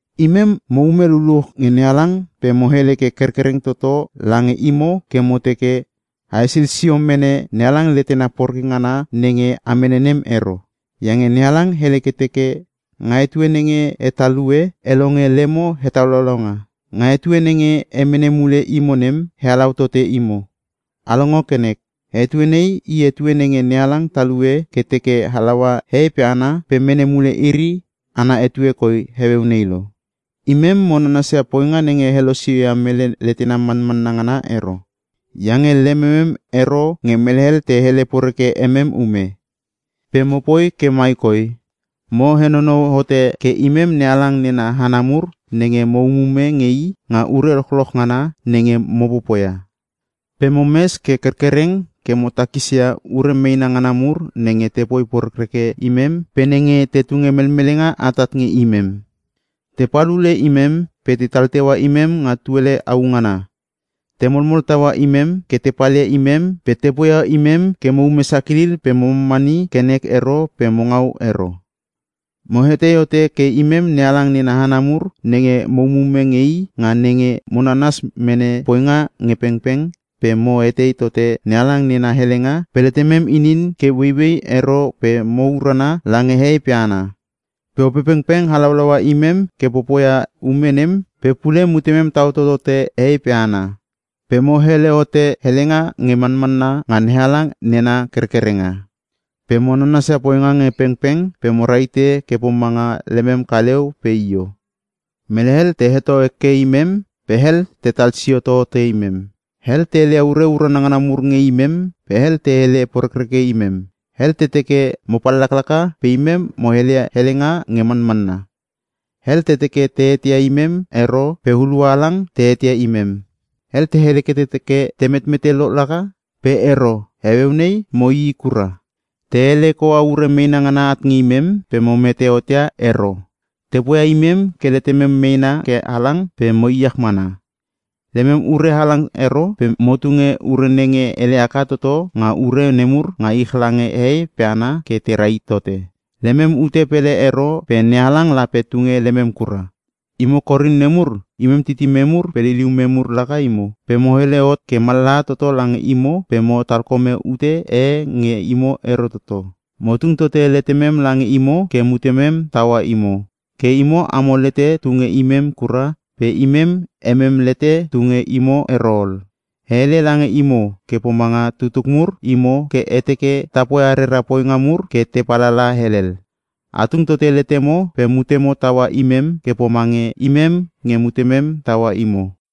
Imem mo ume luluch nge NeHalang pe mo hele ke kerkereng toto lange imo ke mo teke, a hesil sio mene NeHalang letena poreke ngana nenge a mene nem ero. Iange NeHalang hele ke teke, “Nga etue nenge e talue, e longe lemo hetalaulaunga. Nga etue nenge e mene mule imo nem, e halau tote imo.” A longo ke nek! Etue nei i etue nenge NeHalang talue ke teke halaua hehei pe hana pe mene mule iri ana etue koi heueu nei lo. Imem mo nanasia poinga nenge helosio ia mele letena manmanna ngana ero, iange lememem ero nge mele hel te hele poreke emem ume. Pe mopoi ke mai koi; Mo henonou hote ke imem NeHalang nena hana mur nenge mo umume nge i nga ure lochloch ngana nenge mo popoia. Pe mo mes ke kerkereng ke mo takisia ure meena ngana mur nenge tepoi porekreke imem pe nenge te tunge melmelenga atat nge imem. Tepal ule imem pe tetal teua imem nga tuele au ngana, te molmol taua imem ke te palia imem pe te poia imem ke mo ume sakilil pe mo mamani ke nek ero pe mo ngau ero. Mo hetei hote ke imem NeHalang nena hana mur nenge mo umume nge i nga nenge mo nanas mene poinga nge pengpeng, pe mo etei tote NeHalang nena helenga pe letemem inin ke ueiuei ero pe mo urana lange hehei pe hana. Pe Opepengpeng halaulaua imem ke popoia ume nem pe pule mutemem tau totote hehei pe hana. Pe mo hele hote helenga nge manmanna nga NeHalang nena kerkerenga. Pe mo nanasia poinga nge pengpeng, pe mo rahite ke pomanga lemem kaleu pe io. Mele hel te heto hekeke imem pe hel tetal sio totote imem. Hel te heleia ure urana ngana mur nge imem pe hel te hele porekreke imem. Hel te teke mo pallaklaka pe imem mo heleia helenga nge manmanna. Hel te teke te eteia imem ero pe hulua halang te eteia imem. Hel te hele ke te teke, “Te metmete lo laka!” Pe ero, heueu nei mo ii kura. Te ele koua ure meena ngana at nge imem pe mo mete hot ia ero. Te poia imem ke letemem meena ke halang pe mo iech manmana. Lemem ure halang ero pe mo tunge ure nenge ele haka toto nga ure nemur nga ich lange hehei pe hana ke te rahit tote. Lemem ute pele ero pe NeHalang lape tunge lemem kura. Imo Korin nemur, imem titimem mur pe liliumem mur laka imo. Pe mo hele hot ke mallaha toto lange imo pe mo talkome ute e nge imo ero toto. Mo tung tote letemem lange imo ke mutemem taua imo. Ke imo amo lete tu nge imem kura pe imem emem lete tu nge imo ero ol. E hele lange imo ke pomanga tutuk mur imo ke e teke ta poia rera poinga mur ke te palala helel. A tung tote letemo pe mutemo taua imem ke pomange imem nge mutemem taua imo.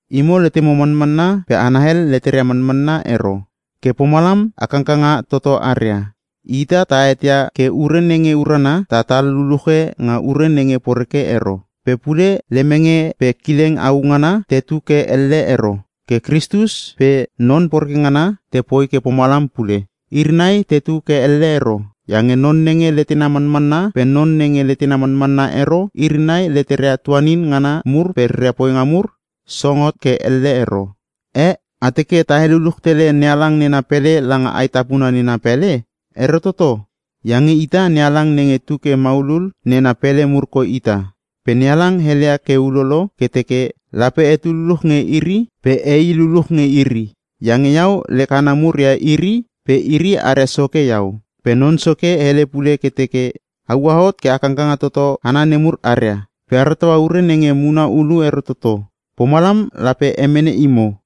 Imo letemo manmanna pe hana hel leteria manmanna ero, ke pomalam a kangkanga toto aria. Ita ta eteia ke ure nenge urana, tatal luluche nga ure nenge poreke ero. Pe pule lemenge pe kileng au ngana tetu ke elle ero. Ke Kristus pe non poreke ngana te poi ke pomalam pule. Iri nai tetu ke elle ero. Iange non nenge letena manmanna pe non nenge letena manmanna ero, iri nai leteria tuanin ngana mur pe reria poinga mur song hot ke elle ero. Eh! A teke ta heluluch tele NeHalang nena pele langa aetapuna nena pele? Ero toto, iange ita NeHalang nenge tuke maulul nena pele mur koi ita. Pe NeHalang heleia ke ulolo ke teke, “Lape etu luluch nge iri pe ei luluch nge iri. Iange iau lek hana mur ia iri pe iri aria Soke iau.” Pe Non Soke hele pule ke teke, “A ua hot ke a kangkanga toto hana nemur aria. Pe a rataua ure nenge muna ulu ero toto. Pomalam lape emene imo.”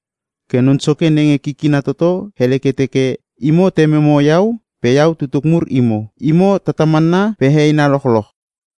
Ke Non Soke nenge kikina toto hele ke teke, “Imo Tememo iau pe iau tutuk mur imo. Imo tatamanna pe heheina lochloch.”